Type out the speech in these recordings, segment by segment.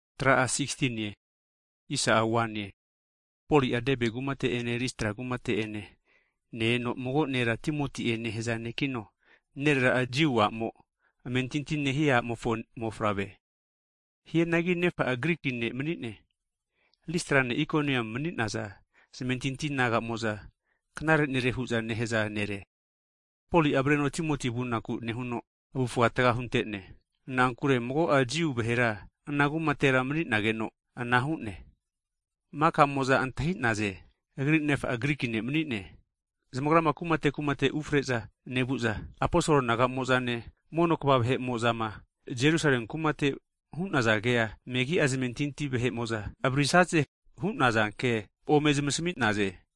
Hagi Poli'a Debe kumate ene Listra kumate'ene ne-eno, mago nera Timoti'e nehaza ne'kino, nerera'a Jiu a'mo amentinti nehia a'mofo mofavre. Hianagi nefa'a Griki ne' mani'ne. Listrane Ikoniamu mani'naza zamentinti naga'mo'za knare nere hu'za nehaza nere. Poli'a avreno Timoti vunaku nehuno avufa taga huntene. Na'ankure mago'a Jiu vahera ana kumatera mani'nageno ana hu'ne, makamo'za antahi'naze agri nefa'a Griki ne' mani'ne. Zamagrama kumate kumate ufare'za nevu'za, aposol naga'mozane mono (elda) kva vahe'mo'zama Jerusalemi kumate'ma hu'naza kea megi'a zamentinti vahe'mo'za avaririsaze hu'naza ke ome zamasmi'naze.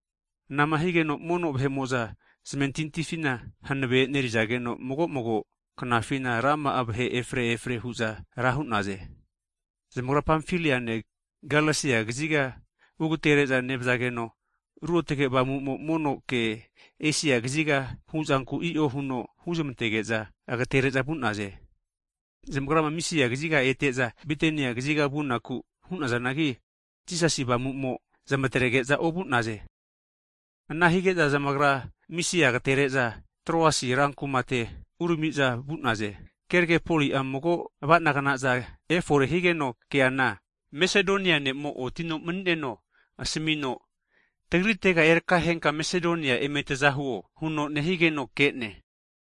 Anama higeno mono vahe'mo'za zamentintifina hanave e'nerizageno, mago mago knafina rama'a vahe efare efare hu'za ra hu'naze. Zamagra Pamfaliane, Galesia kaziga ugatere'za nevazageno, Ruotge Avamu'mo mono ke Esia kaziga huzanku i'o huno huzamantege'za agatere'za vu'naze. Zamagrama Misia kaziga ete'za, Bitania kaziga vunaku hu'nazanagi, Jisasi Avamu'mo zamatrege'za ovu'naze. Ana hige'za zamagra Misia agatere'za, Troasi rankumate urami'za vu'naze. Keragera Poli'a mago ava'nagnaza efore higeno keana, Masedonia ne'mo otino mani'neno asamino, tagritega erakahenka Masedonia eme taza huo huno nehigeno ke'ne!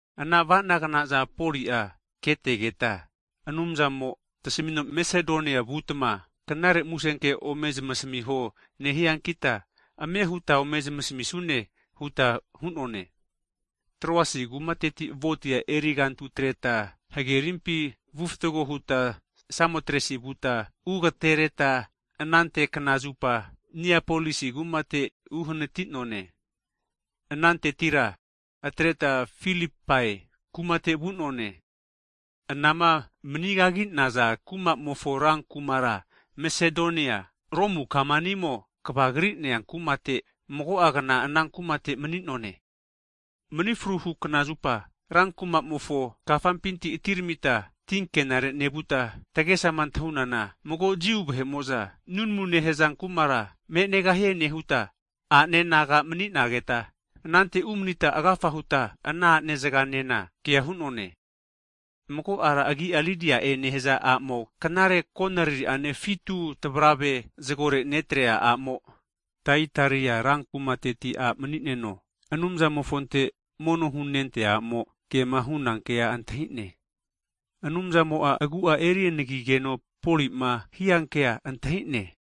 Ana avanagnaza Poli'a ketegeta, Anumzamo'a tasmino Masedonia vutma Knare Musenke ome zamasmiho nehiankita, ame huta ome zamasmisune huta hu'none. Troasi kumateti ventea erigantu atreta hagerimpi vufatgo huta Samotresi vuta, ugatereta anante kna zupa Niapolisi kumate uhanati'none. Anantetira atreta Filipai kumate vu'none, anama mani kagi'naza kumamofo, ran kumara Masedonia, Romu kamanimo kavagri'nea kumate mago'a kna ana kumate mani'none. Mani fruhu knazupa rankumamofo kafampinti atiramita tinkenare nevuta, tagesama antahunana mago'a Jiu vahe'mo'za nunamu nehaza kumara me'negahie nehuta, a'ne naga maninageta anante umanita agafa huta, ana a'ne naga'enena kea hu'none. Mago ara agi'a Lidia'e nehaza a'mo knare konariri'ane fitu tavrave hatino zagore netrea a'mo, Taitaria rankumateti a' mani'neno Anumzamofonte mono hunentea a'mo kema huna kea antahi'ne. Anumzamo'a agu'a eri rukrehe higeno Poli'ma hiankea antahi'ne.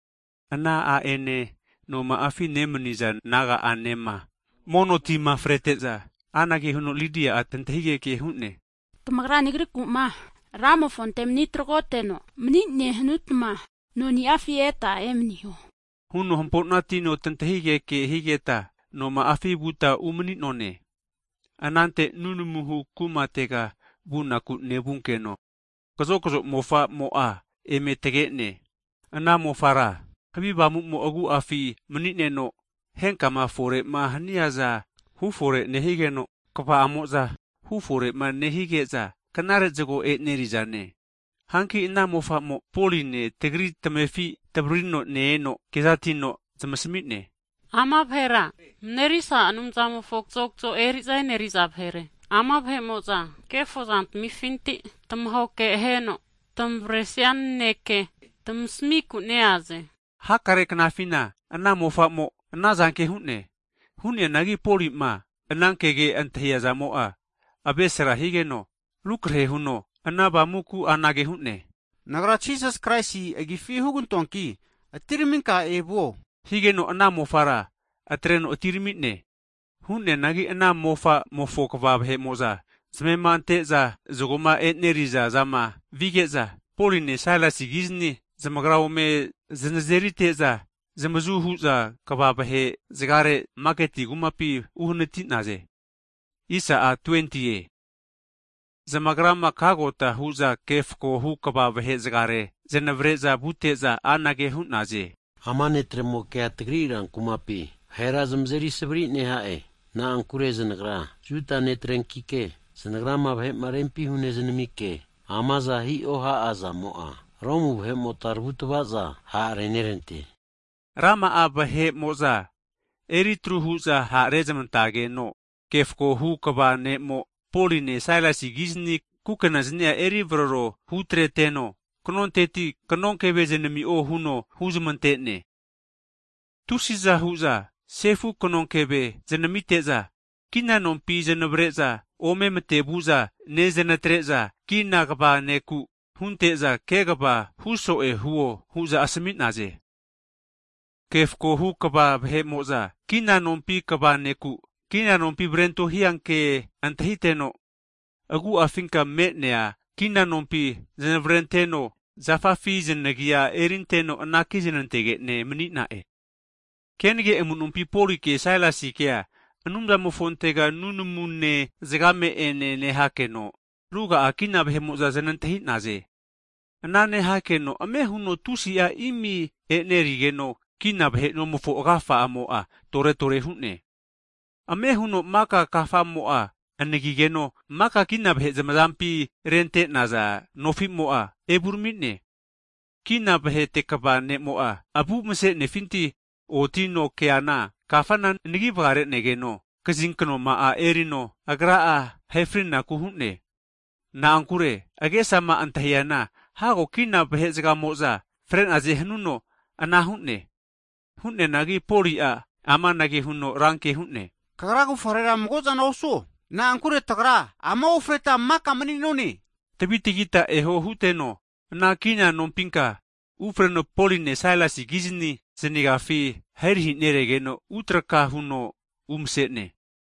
Ana a'ene noma'afi nemani'za naga'anema mono tima frete'za, anage huno Lidia'a tantahigeke hu'ne, Tamagra nagriku'ma Ramofonte mani tragoteno'ma mani'ne hanutma noni'afi eta emaniho, huno hampo'natino tantahigeke higeta noma'afi vuta umani'none. Anante nunamuhu kumatega vunaku nevunkeno, kazokzo eri'za mofa'mo'a eme tage'ne. Ana mofara havi avamu'mo agu'afi mani'neno henkama fore'ma haniaza hufore nehigeno, kva'amo'za hufore'ma nehige'za knare zago e'nerizane. Hanki ana mofa'mo Poline tagri tamefi tavririno ne-eno kezatino zmasamine, Ama vahera Marerisa Anumzamofo kazokzo eri'za eneri'za vahere. Ama vahe'mo'za kefozantamifinti tmahoke aheno tamavaresia naneke tamasmiku neaze. Hakare knafina ana mofa'mo anazanke hu'ne. Hu'neanagi Poli'ma anankege antahiazamo'a avesra higeno, rukrehe huno ana avamuku anage hu'ne, Nagra Jisas Kraisi agifi hugantoanki atiraminka evuo! Higeno ana mofara atreno atirami'ne. Hu'neanagi ana mofa'mofo kva vahe'mo'za zamema ante'za zagoma e'neriza zama vige'za, Poline Sailasikizni zamagra ome zanazerite'za, zanavazu hu'za kva vahe'zagare maketi kumapi maninarega vu'naze. Zamagrama kagota hu'za ke fakohu (megistret) kva vahe zagare zanavare'za vute'za anage hu'naze. Ama netremokea tagri ran kumapi vahera zamazeri savari neha'e, na'ankure zanagra Juda netrenkike, zanagrama vahe'ma rempi hunezmike amaza hiho ha'azamo'a, Romu vahe'mota tavutava'za ha'renerante. Rama'a vahe'mo'za eri atru hu'za ha' rezmantageno, ke fakohu kva vahe'mo'za Poline Sailasikizni kukena zani'a eri vararo hutrete'za, kanonteti knonkeve zanami'o hu'za huzmante'naze. Tusiza hu'za sefu kanonkeve zanamite'za, kina nompi zanavare'za ome matevu'za nezanatre'za, kina nonte kva nekura hunte'za, kegava huso'e huo hu'za asami'naze. Ke fakohu kva vahe'mo'za, kina nompi kva ne'ku, kina nompi znavrento hia ke antahiteno, agu'afinka me'nea kinanompi zanavarenteno, zafafi zanagia erinteno anaki znantege'ne mani'na'e. Kenage amu'nompi Polike Sailasikea, Anumzamofontega nunamune zagame'ene nehakeno, ruga'a kina vahe'mo'za zanantahi'naze. Ana nehakeno ame huno tusi'a imi enerigeno, kina vahe nomofo agafa'amo'a tore tore hu'ne. Ame huno maka kafamo'a anagigeno, maka kina vahe zamazampi rente'naza nofimo'a evurami'ne. Kina vahete kva ne'mo'a avu vase'nefinti otino, keana kafana anagi vagare'negeno, bainati kazinknoma'a erino agra'a ahefrinaku hu'ne. Na'ankure agesama antahiana hago kina vahe'zagamo'za fre'naze hanuno ana hu'ne. Hu'neanagi Poli'a amanage huno ranke hu'ne, Kagra kavufarera mago'zana osuo, na'ankure tagra ama ofreta maka mani'none! Tavi tagita eho huteno ana kina nompinka ufareno Poline Sailasi kizni zanagiafi ahirahi neregeno utraka huno umase'ne.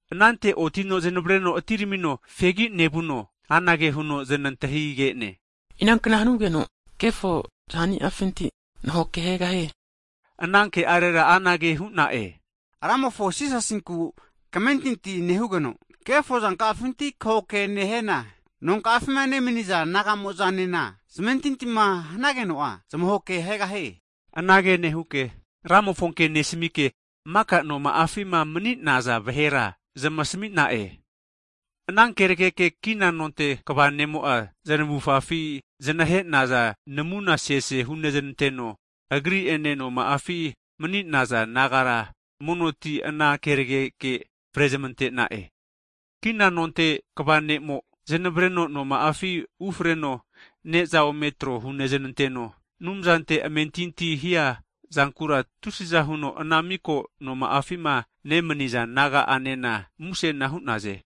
Anante otino zanavreno atiramino fegi nevuno, amanage huno zanantahige'ne, Ina kna hanugeno kefo zaniafinti nahoke ahegahie? Ana ke'arera anage hu'na'e, Ramofo Jisasinte kamentinti nehugeno, kefozanka'afinti kahoke neheno, nonka'afima nemani'za naga'moza'nema zamentintima hanageno'a zamahoke ahegahie. Anage nehuke Ramofonke nesamike, maka noma'afima mani'naza vahera zamasami'na'e. Ana kenageke kina nonte kva nemo'a zanavufafi zanahe'naza namuna sese huznantetegeno, agri'ene noma'afi mani'naza nagara mono ti ana keregeke frezmante'na'e. Kina nonte kva ne'mo zanavreno noma'afi ufareno ne'za ome tro huznanteteno, Anumzante amentinti hia zankura, tusiza huno ana miko noma'afima nemaniza naga'anena musena hu'naze.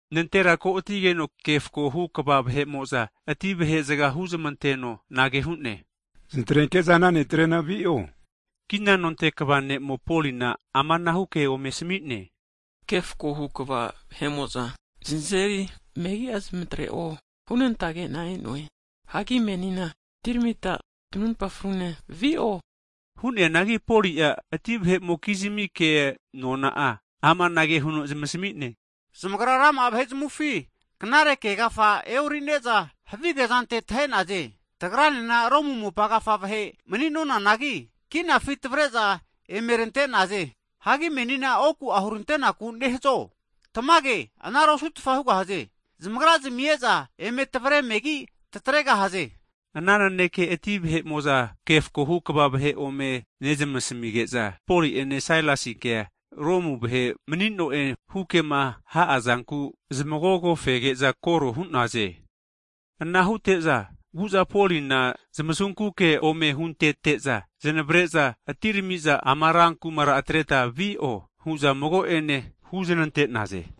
Nantera ko'atigeno ke fakohu kva vahe'mo'za, ati vahe zaga huzamanteno anage hu'ne, zanatrenke'za ana ne'trena vi'o hu'naze. Kina nonte kva ne'mo Polina amanahu ke ome asami'ne. Ke fakohu kva vahe'mo'za (jas) zanazeri megi'a zanatre'o hunantage'na e'noe, hagi menina atiramita tanarimpa frune vi'o huno zanasmi'ne. Hu'neanagi Poli'a ati vahe'mokizmi ke nona'a amanage huno zamasmi'ne. Zamagra rama'a vahe zamufi knare ke agafa e'orine'za havige zante tahenaze, tagranena Romu mopa agafa vahe mani'nonanagi, kinafi tavare'za emerante'naze. Hagi menina oku'a hurantenaku nehazo? Tamage anara osu'tfa hugahaze! Zamagra'zmi e'za eme tavare megi tatregahaze. Ana naneke ati vahe'mo'za ke fakohu kva vahe ome nezamasmige'za nentahi'za, Poli'ene Sailasikea Romu vahe mani'no'e hukema ha'azanku zamagogogu nehu'za koro hu'naze. Ana hute'za vu'za Polina zamasunku ke ome huznantete'za, zanavre'za atirami'za ama ran (siti) kumara atreta vi'o hu'za mago'ane huzanante'naze.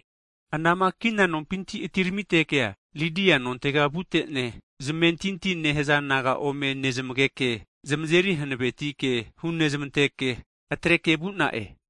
Anama kina nompinti atiramitekea Lidia nontega vute'ne, zamentinti nehaza naga ome nezamageke, zamazeri hanaveti ke hunezmanteke atreke vu'na'e.